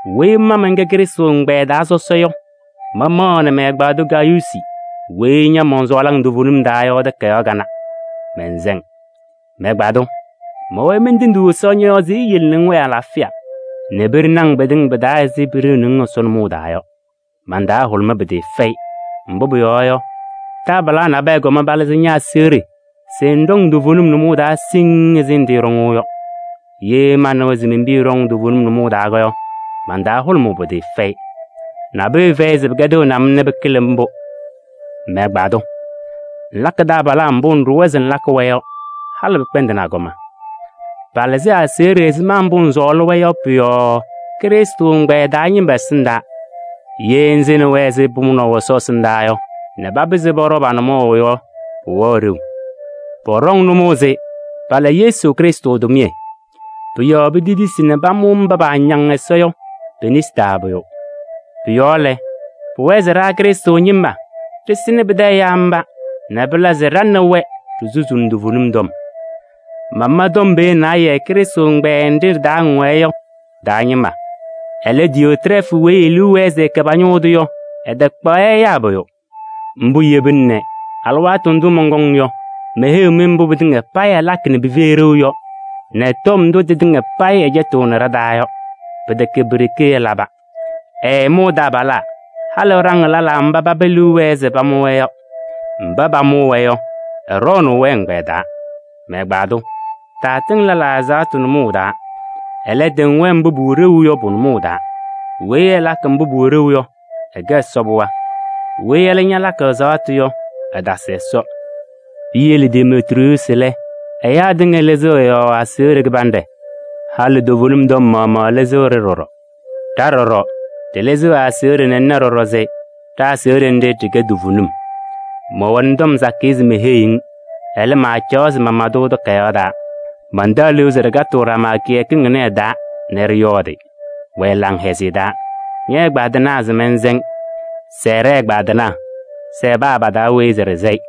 Weyi ma mɛnkɛ Krɩstʋ ɛgbɛyɛ taa sɔsɔ yɔ, mamaɣnɩ mɛ-ɛgbaadʋ Gayuusi weyi ña mɔnsɔɔlɩ toovenim taa yɔ takayaɣ kanɛ, mɛnsɛ-ŋ. Mɛ-ɛgbaadʋ! Mɛwɛɛ mentendiɣ Ɛsɔ ñɔ-yɔɔ se eyele nɛ ŋwɛɛ alaafɩya nɛ piɖeni-ŋ pɩtɩŋa pɩ-taa ɛzɩ piɖeuni-ŋ Ɛsɔ nʋmɔʋ taa yɔ. Man-taa hʋlʋmaa pɩtɩɩfɛyɩ, mbʋ pʋyɔɔ yɔ, taabalaa nabɛyɛ kɔm palɩzɩ ña-aseɣɖe se ŋɖɔŋ toovenim nʋmɔʋ taa siŋŋ ɛzɩ ŋtɩɩɖɔŋʋʋ yɔ. Ye manɩwa se men-piya ɖɔŋ toovenim nʋmɔʋ taa yɔ, man-taa hʋlʋmʋʋ pɩtɩɩfɛyɩ. Nabʋyʋ fɛyɩ se pɩkɛdɩɣnɩ-m nɛ pɩkɩlɩ mbʋ. Mɛ-ɛgbaadʋ! Ŋlakɩ taabalaa mbʋ ŋɖʋwa se ŋlakɩ-wɛ yɔ, halɩ pɩkpɛndɩnɩ agɔma. Palɩzɩ aseɣɖe ɛzɩma mbʋ ŋsɔɔlɩ-wɛ yɔ pʋ-yɔɔ Krɩstʋ ɛgbɛyɛ taa ñɩma ɛsɩndaa. Ye ŋsɩnɩ-wɛ ɛzɩ pʋmʋnaʋ Ɛsɔ ɛsɩndaa yɔ nɛ papɩzɩ pɔɖɔ pa-nʋmɔʋ yɔ, pʋwɛɣ ɖeu. Pɔɖɔŋ nʋmɔʋ se pala Yesu Krɩstʋ tʋmɩyɛ. Pʋ-yɔɔ petetisi nɛ pamʋ mba paañaŋ Ɛsɔ yɔ pe-nesi taa pʋyʋ. Pʋ-yɔɔ lɛ, pʋwɛɛ se ɖa Krɩstʋ ñɩma ɖɩsɩnɩ pɩtɛ ɛyaa mba nɛ pɩla se ɖa nɛ wɛ ɖisusuuni toovenim tɔm. Mama tɔm pee naayɛ Krɩstʋ ɛgbɛyɛ nɖɩ ɖɩ-taa ŋwɛɛ yɔ ɖɩ-taa ñɩma. Ɛlɛ, Diyootrɛɛfʋ weyi e-liu wɛɛ se ɛkɛ pa-ñʋʋ tʋ yɔ, ɛtakpaɣ-yɛ nɛ ɛyaa pʋyʋ. Mbʋ yebina nɛ alɩwaatʋ ndʋ mɔnkɔŋ yɔ, meheyiɣ-mɩ mbʋ pɩtɩŋa payɩ ɛlakɩ nɛ pɩfɛyɩ ɖeu yɔ, nɛ tɔm ndʋ tɩtɩŋa payɩ ɛcɛtɩɣnɩ ɖa-taa yɔ. Pɩtɛkɛ pi-ɖeke ɛlaba. Ɛɛmʋʋ taabalaa, halɩ ɛɖaŋɩɣ lɛlaa mba paba liu wɛɛ se pamʋ-wɛ yɔ. Mba pamʋʋ-wɛ yɔ, ɛɖɔɔnʋʋ-wɛ ɛgbɛyɛ taa. Mɛ-ɛgbaadʋ! Taatɩŋ lɛlaa ɛzaɣtʋ nʋmɔʋ taa, ɛlɛ, tɩŋ-wɛ mbʋ pʋwɛ ɖeu yɔ pʋ-nʋmɔʋ taa. Weyi ɛlakɩ mbʋ pʋwɛ ɖeu yɔ, ɛkɛ Ɛsɔ pɩɣa. Weyi ɛlɛ ñalakɩ ɛzaɣtʋ yɔ, ɛtasɩ Ɛsɔ. Piyele Demetriyuusi lɛ, ɛyaa tɩŋa lɩzɩɣ ɛ-yɔɔ aseɣɖe kɩbanɖɛ, halɩ toovenim tɔm maɣmaɣ lɩzɩɣ-ɖɩ ɖɔɖɔ. Ɖa ɖɔɖɔ, ɖɩlɩzɩɣ ɛ-aseɣɖe nɛ ŋna ɖɔɖɔ se ɖa-aseɣɖe nɖɩ, ɖɩkɛ toovenim. Mɛwɛnɩ tɔm sakɩyɛ se meheyiɣ-ŋ, ɛlɛ, maacaɣ se mama-tʋ takayaɣ taa. Mantaɣ liu se ɖɩkatɩɣ ɖama kɩyakɩŋ ɩnɛ ɩ-taa nɛ ɖɩyɔɔdɩ. Wɛɛ laŋhɛzɩyɛ taa! Ñɛ-ɛgbaadɩnaa se mɛnsɛ-ŋ. Sɛɛ ɖɛ-ɛgbaadɩnaa, sɛɛ paa pa-taa weyi se ɖɩsɛ-ɩ.